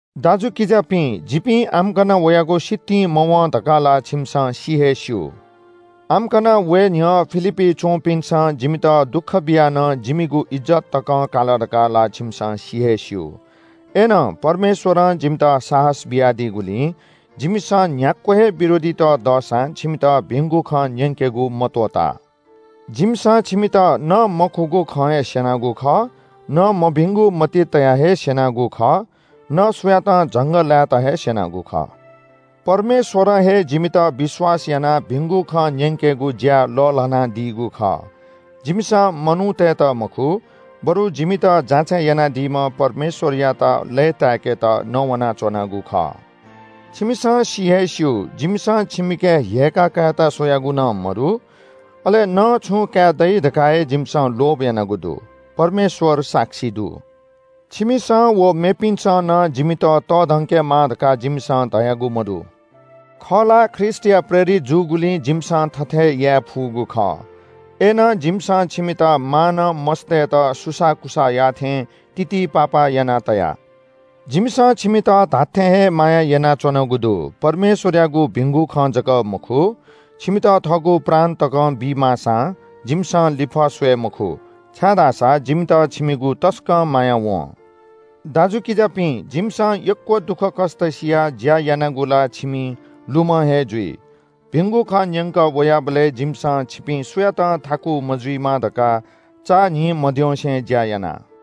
दाजुकिजापिं, जिपिं आम्‍कन वयागु सितिं मवं धकाः ला छिमिसं सि हे स्‍यू। आम्‍कन वये न्‍ह्यः फिलिप्‍पी च्‍वंपिन्‍सं जिमित दुःख बियाः नं जिमिगु इज्‍जत तकं काल धकाः ला छिमिसं सि हे स्‍यू। अय्‌नं परमेश्‍वरं जिमित साहस बियादीगुलिं जिमिसं न्‍ह्याक्‍व हे विरोधीत दःसां छिमित भिंगु खँ न्‍यंकेगु मत्‍वःता। जिमिसं छिमित न मखुगु खँ हे स्‍यनागु खः, न मभिंगु मतिइ तयाः हे स्‍यनागु खः, न सुयातं झंगःलाय्‌त हे स्‍यनागु खः। परमेश्‍वरं हे जिमित विश्‍वास यानाः भिंगु खँ न्‍यंकेगु ज्‍या लःल्‍हानादीगु खः। जिमिसं मनूतय्‌त मखु, बरु जिमित जाँचय् यानादीम्‍ह परमेश्‍वरयात लय्‌ताय्‌केत नवानाच्‍वनागु खः। छिमिसं सि हे स्‍यू, जिमिसं छिमिके ह्यय्‌का कायेत स्‍वयागु नं मदु, अले न छुं काये दइ धकाः हे जिमिसं लोभ यानागु दु। परमेश्‍वर साक्षी दु। छिमिसं व मेपिन्‍सं नं जिमित तःधंकेमाः धकाः जिमिसं धयागु मदु। खः ला, ख्रीष्‍टया प्रेरित जूगुलिं जिमिसं थथे याये फुगु खः। अय्‌नं जिमिसं छिमित मांनं मस्‍तय्‌त सुसाःकुसाः याः थें तितिपापा याना तया। जिमिसं छिमित धात्‍थें हे माया यानाच्‍वनागु दु। परमेश्‍वरयागु भिंगु खँ जक मखु, छिमित थःगु प्राण तकं बी माःसां जिमिसं लिफः स्‍वये मखु, छाय्‌धाःसा जिमित छिमिगु तसकं माया वं। दाजुकिजापिं, जिमिसं यक्‍व दुःखकष्‍ट सियाः ज्‍या यानागु ला छिमि लुमं हे जुइ। भिंगु खँ न्‍यंकः वयाबलय् जिमिसं छिपिं सुयातं थाकु मजुइमा धकाः चान्‍हि मद्यंसे ज्‍या याना।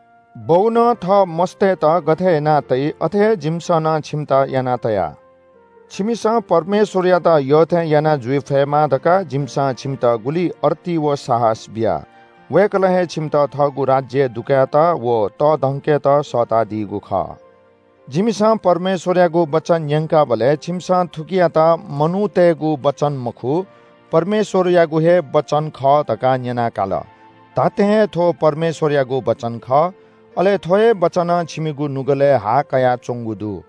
बौनं थः मस्‍तय्‌त गथे याना तइ, अथे हे जिमिसं नं छिमित याना तया। छिमिसं परमेश्‍वरयात यःथें याना जुइ फयेमा धकाः जिमिसं छिमित गुलि अर्ती व साहस बिया। वय्‌कलं हे छिमित थःगु राज्‍यय् दुकायेत व तःधंकेत सःतादीगु खः। जिमिसं परमेश्‍वरयागु वचन न्‍यंकाबलय् छिमिसं थुकियात मनूतय्‌गु वचन मखु, परमेश्‍वरयागु हे वचन खः धकाः न्‍यना काल। धात्‍थें हे थ्‍व परमेश्‍वरयागु वचन खः। अले थ्‍व हे वचनं छिमिगु नुगलय् हा कयाच्‍वंगु दु।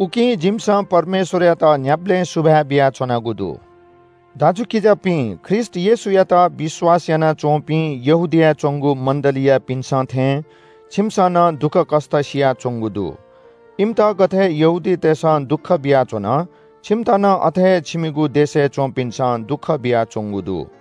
उकिं जिमिसं परमेश्‍वरयात न्‍ह्याबलें सुभाय् बियाच्‍वनागु दु। दाजुकिजापिं, ख्रीष्‍ट येशूयात विश्‍वास यानाच्‍वंपिं यहूदियाय् च्‍वंगु मण्‍डलीयापिन्‍सं थें छिमिसं नं दुःखकष्‍ट सियाच्‍वंगु दु। इमित गथे यहूदीतय्‌सं दुःख बियाच्‍वन, छिमित नं अथे हे छिमिगु देशय् च्‍वंपिन्‍सं दुःख बियाच्‍वंगु दु।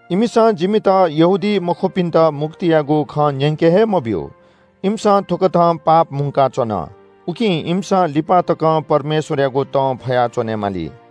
इमिसं जिमित यहूदीमखुपिन्‍त मुक्तियागु खँ न्‍यंके हे मब्‍यू। इमिसं थुकथं पाप मुंकाच्‍वन। उकिं इमिसं लिपा तकं परमेश्‍वरयागु तं फया च्‍वनेमाली।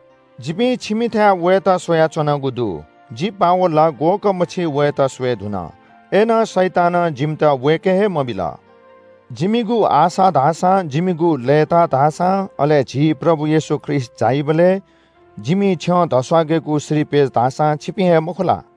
जिपिं छिमिथाय् वयेत स्‍वयाच्‍वनागु दु। जि पावल ला ग्‍वःकःमछि वयेत स्‍वये धुन। अय्‌नं शैतानं जिमित वय्‌के हे मबिल। जिमिगु आशा धाःसां, जिमिगु लय्‌ताः धाःसां, अले झी प्रभु येशू ख्रीष्‍ट झाइबलय् जिमि छ्यं धस्‍वाकेगु श्रीपेच धाःसां छिपिं हे, मखु ला?